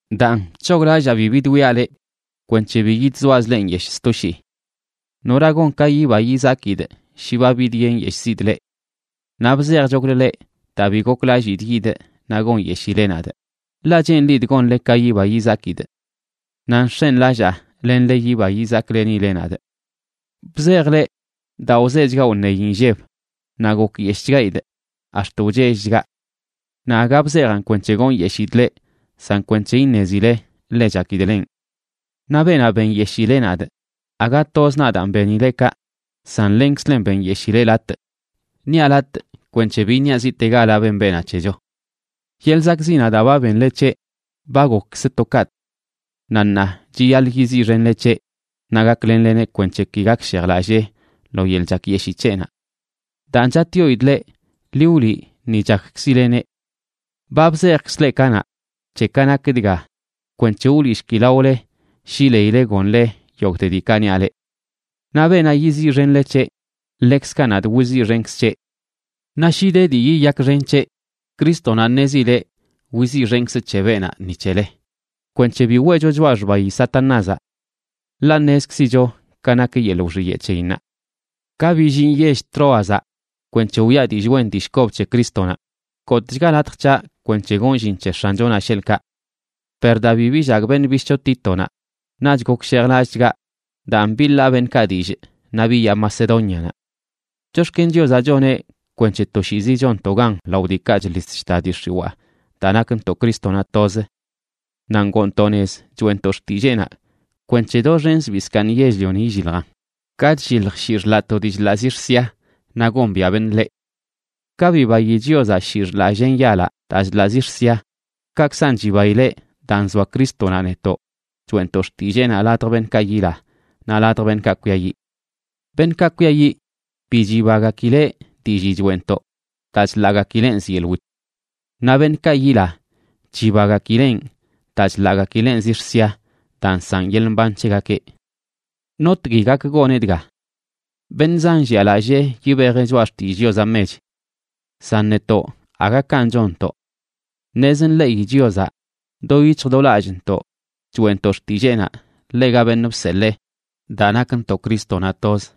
Daan, bc̱hoglallaa bi bidwiaꞌ leꞌ kwenc̱he bi yidzoazꞌ leꞌ nyeshꞌ sto shii. ¿Nora gon ka yiba yizakidꞌ shi ba bidyenyeshꞌzidꞌ leꞌ? Naꞌ bzejchoklə leꞌ daa bi goklallidꞌ yidꞌ naꞌ gonyeshile nadꞌ, ḻaꞌ cheenlidꞌ gonle ka yiba yizakidꞌ. Naꞌ nx̱enlallaa lenle yiba yizaklenile nadꞌ. Bzejꞌ leꞌ daa wzechgaꞌ wṉeyi nlleb naꞌ gokyeshꞌchgaidꞌ ax̱t wchellchgaꞌ. Naꞌ aga bzejaꞌn kwenc̱he gonyeshidꞌ leꞌ san kwenc̱he iṉezile ḻe chakidꞌ lenꞌ. Naꞌ beenaꞌ benyeshileꞌ nadꞌ, aga toz nadaan benileꞌ kaꞌ, san lenkzlen benyeshileꞌ latꞌ. Niaꞌ “latꞌ”, kwenc̱he bi iṉiaꞌ ziꞌtegala ben beenaꞌ c̱hecho. Yeḻꞌ zakꞌziꞌnaꞌ daa ba benle c̱heꞌ ba gokkzə to kaꞌtꞌ. Naꞌ ṉaa chiyaḻꞌ yiziꞌxenle c̱heꞌ naꞌ gaklenleneꞌ kwenc̱he ki gakshejlallee lo yeḻꞌ chakyeshii c̱heꞌnaꞌ. Daan, chatꞌyoidꞌ leꞌ, ḻi wliꞌ ni chakkzileneꞌ. Ba bzejkzꞌ leꞌ kanaꞌ c̱he ka nak dga kwenc̱he wliꞌshkilaole shi leile gonle yogꞌte diikaꞌ niaꞌ leꞌ. Naꞌ beenaꞌ yiziꞌxenle c̱heꞌ, ḻekzkaꞌ nadꞌ wiziꞌxenkzꞌ c̱heꞌ. Naꞌ shi de dii yiyakxen c̱heꞌ, Crístonaꞌ ṉezileꞌ wiziꞌxenkzꞌ c̱he beenaꞌ ni c̱hele, kwenc̱he bi weꞌcho choꞌa xbayi Satanázaꞌ. Ḻaꞌ ṉezkzicho ka nak yeḻꞌ wxiyeꞌ c̱heyinnaꞌ. Ka billinꞌ yell Troazaꞌ kwenc̱he wiꞌa dillꞌ wen dillꞌ kob c̱he Crístonaꞌ, gotꞌchga latj c̱haꞌ kwenc̱he gonꞌ llin c̱he X̱anchonaꞌ, sheḻꞌkaꞌ. Per daa bi billagꞌ beṉꞌ bishꞌcho Títonaꞌ, naꞌch gokshejlallꞌchgaꞌ. Daan, biḻaa beṉꞌkaꞌ dillꞌ naꞌ biyaa Macedónianaꞌ. Chox̱ken Chiozaꞌ choneꞌ kwenc̱he toshiizi chonntoꞌ gan lao diikaꞌ chḻis chta dii x̱iwaa daa nakntoꞌ Crístonaꞌ toz. Naꞌ ngoontoꞌ nez choeꞌntoꞌ xtilleenaꞌ kwenc̱he doxen zbii zkaaṉ yell-lioni illiljan, ka chllilj shii xḻaꞌ to dii chḻaꞌ zix̱ sia, naꞌ gombiaꞌ beṉꞌ ḻeꞌ. Ka bibayi Chiozaꞌ shii xḻaꞌ llen yalaꞌ daa chḻaꞌ zix̱ sia, kaꞌkzan chibaileꞌ daa nzoa Crístonaꞌ netoꞌ choeꞌntoꞌ xtilleenaꞌ ladj beṉꞌkaꞌ yila naꞌ ladj beṉꞌkaꞌ kwiayiꞌ. Beṉꞌkaꞌ kwiayiꞌ, bi chibagakileꞌ dillii choeꞌntoꞌ daa chḻaꞌgakileꞌn zyeḻꞌ wit. Naꞌ beṉꞌkaꞌ yila, chibagakileꞌn daa chḻaꞌgakileꞌn zix̱ sia daa nsaꞌn yeḻꞌ mban c̱hegakeꞌ. ¿Notgui gak goneꞌ dga? Beṉꞌ zan llialallee yibejeꞌ choꞌa xtillꞌ Chiozaꞌ mech. San netoꞌ aga kanꞌ chonntoꞌ. Ṉez nḻeꞌi Chiozaꞌ do yic̱hj do lallꞌntoꞌ choeꞌntoꞌ xtilleenaꞌ ḻega beṉꞌ bseḻee, daa nakntoꞌ Crístonaꞌ toz.